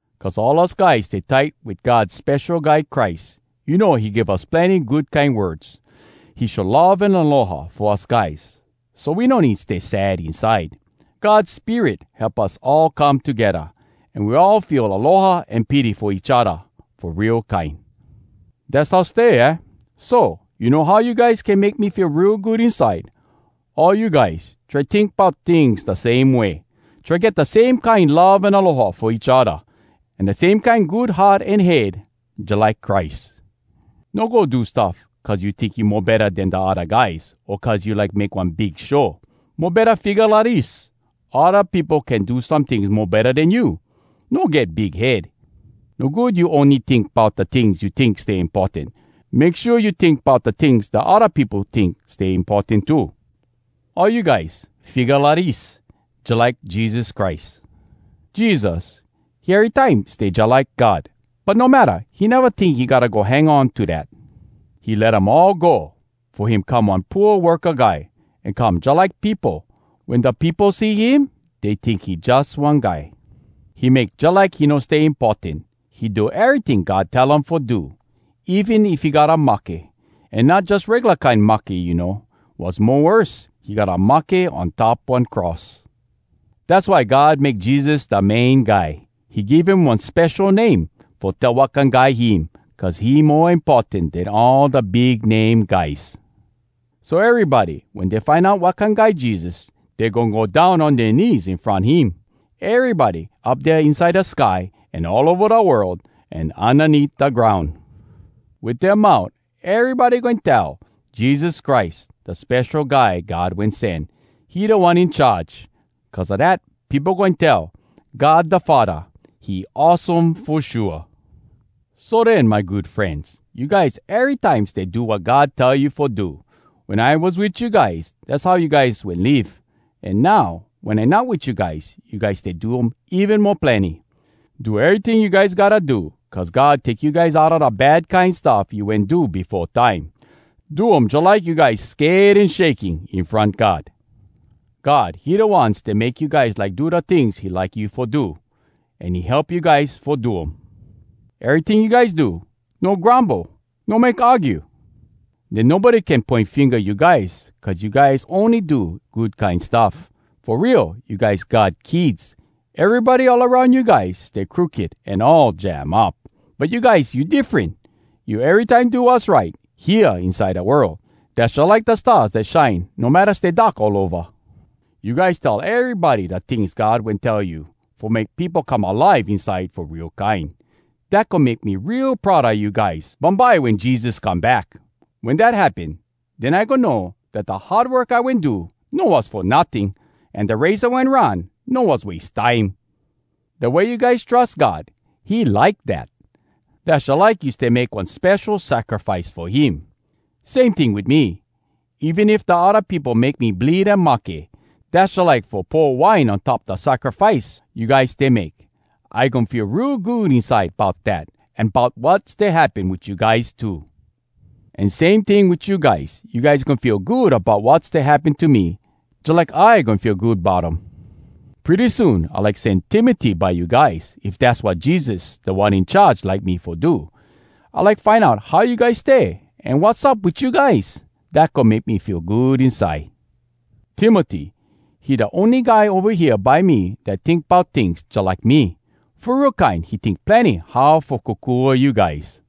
Cuz all us guys stay tight wit God Spesho Guy Christ, you know he give us plenny good kine words. He show love an aloha fo us guys, so we no need stay sad inside. God Spirit help us all come togedda. An we all feel aloha an pity fo each odda fo real kine. Dass how stay, aah? So! You know how you guys can make me feel real good inside? All you guys, try tink bout tings da same way. Try get da same kine love an aloha fo each odda, an da same kine good heart an head jalike Christ. No go do stuff cuz you tink you mo betta den da odda guys, o cuz you like make one big show. Mo betta, figga lidis: odda peopo can do some tings mo betta den you. No get big head. No good you ony tink bout da tings you tink stay importan—make shua you tink bout da tings da odda peopo tink stay importan too. All you guys, figga lidis, jalike Jesus Christ. Jesus, he erytime stay jalike God. But no matta, He neva tink he gotta go hang on to dat. He let um all go Fo him come one pooa worka guy, An come jalike peopo. Wen da peopo see him, Dey tink he jus one guy. He make jalike he no stay importan. He do eryting God tell um fo do, Even if he gotta mahke. An not jus regula kine mahke, you know. Was mo worse, he gotta mahke on top one cross! Dass why God make Jesus da Main Guy. He give him one spesho name, Fo tell wat kine guy him. Cuz he mo importan den all da big name guys! So erybody, wen dey find out wat kine guy Jesus, Dey goin go down on dea knees in front him. Erybody up dea inside da sky, An all ova da world, An undaneat da groun! Wit dea mout, erybody goin tell, “Jesus Christ, da Spesho Guy God Wen Sen, He Da One In Charge!” Cuz a dat, peopo goin tell, “God da Faddah, he awesome fo shua!” So den, my good frenz, you guys erytime stay do wat God tell you fo do. Wen I was wit you guys, dass how you guys wen live. An now, wen I not wit you guys, you guys stay do um even mo plenny. Do eryting you guys gotta do cuz God take you guys outa da bad kine stuff you wen do befo time. Do um jalike you guys sked an shaking in front God. God, he da One stay make you guys like do da tings he like you fo do. An he help you guys fo do um. Eryting you guys do, no grumble, no make argue. Den nobody can poin finga you guys cuz you guys ony do good kine stuff. Fo real, you guys God kids! Erybody all aroun you guys stay crooked an all jam up. But you guys, you diffren. You erytime do wass right, hea inside da world. Dass jalike da stars dat shine no matta stay dark all ova. You guys tell erybody da tings God wen tell you, fo make peopo come alive inside fo real kine. Dat goin make me real proud a you guys bumbye wen Jesus come back! Wen dat happen, den I goin know dat da hard work I wen do, no was fo notting! An da race I wen run, no was wase time! Da way you guys trus God, he like dat. Dass jalike you stay make one spesho sacrifice fo him. Same ting wit me—even if da odda peopo make me bleed an mahke, dass jalike fo pour wine on top da sacrifice you guys stay make. I goin feel real good inside bout dat, an bout wat stay happen wit you guys too! An same ting wit you guys. You guys goin feel good bout wat stay happen to me jalike I goin feel good bout um. Pretty soon I like sen Timoty by you guys, if dass wat Jesus, Da One In Charge, like me fo do. I like find out how you guys stay, an wassup wit you guys. Dat goin make me feel good inside. Timoty, he da ony guy ova hea by me dat tink bout tings jalike me. Fo real kine, he tink plenny how fo kokua you guys.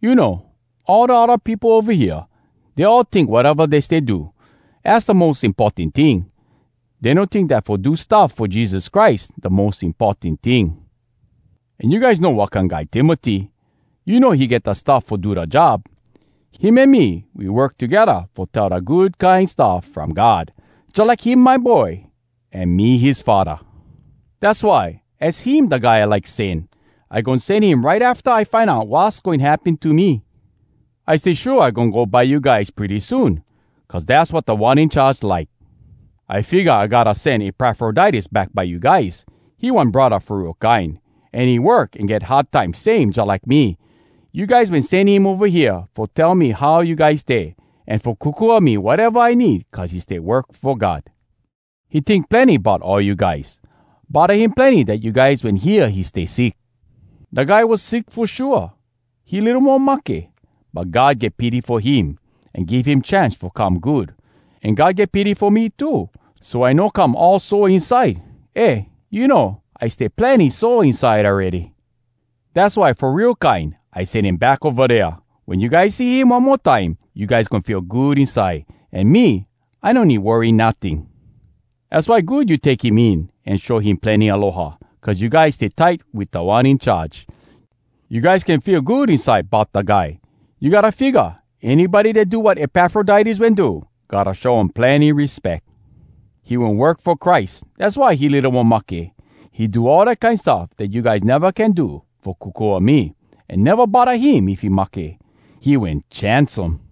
You know, all da odda peopo ova hea, dey all tink wateva dey stay do, az da mos importan ting—dey no tink dat fo do stuff fo Jesus Christ da mos importan ting. An you guys know wat kine guy Timoty—you know he get da stuff fo do da job. Him an me, we work togedda fo tell da Good Kine Stuff From God. Jalike him my boy an me his faddah. Dass why, az him da guy I like sen. I goin sen him right afta I find out wass goin happen to me. I stay shua I goin go by you guys pretty soon cuz dass wat Da One In Charge like. I figga I gotta sen Epafroditus back by you guys. He one braddah fo real kine, an he work an get hard time same jalike me. You guys wen sen him ova hea fo tell me how you guys stay, an fo kokua me wateva I need cuz he stay work fo God. He tink plenny bout all you guys. Bodda him plenny dat you guys wen hear he stay sick. Da guy was sick fo shua—he litto mo mahke. But God get pity fo him, an give him chance fo come good. An God get pity fo me too, so I no come all sore inside—eh, you know, I stay plenny sore inside awready. Dass why fo real kine I sen him back ova dea. Wen you guys see him one mo time, you guys goin feel good inside, an me, I no need worry notting. Az why good you take him in an show him plenny aloha, cuz you guys stay tight wit Da One In Charge. You guys can feel good inside bout da guy. You gotta figga, anybody dat do wat Epafroditus wen do, gotta show um plenny respeck. He wen work fo Christ. Dass why he litto mo mahke. He do all da kine stuff dat you guys neva can do fo kokua me, an neva bodda him if he mahke. He wen chance um.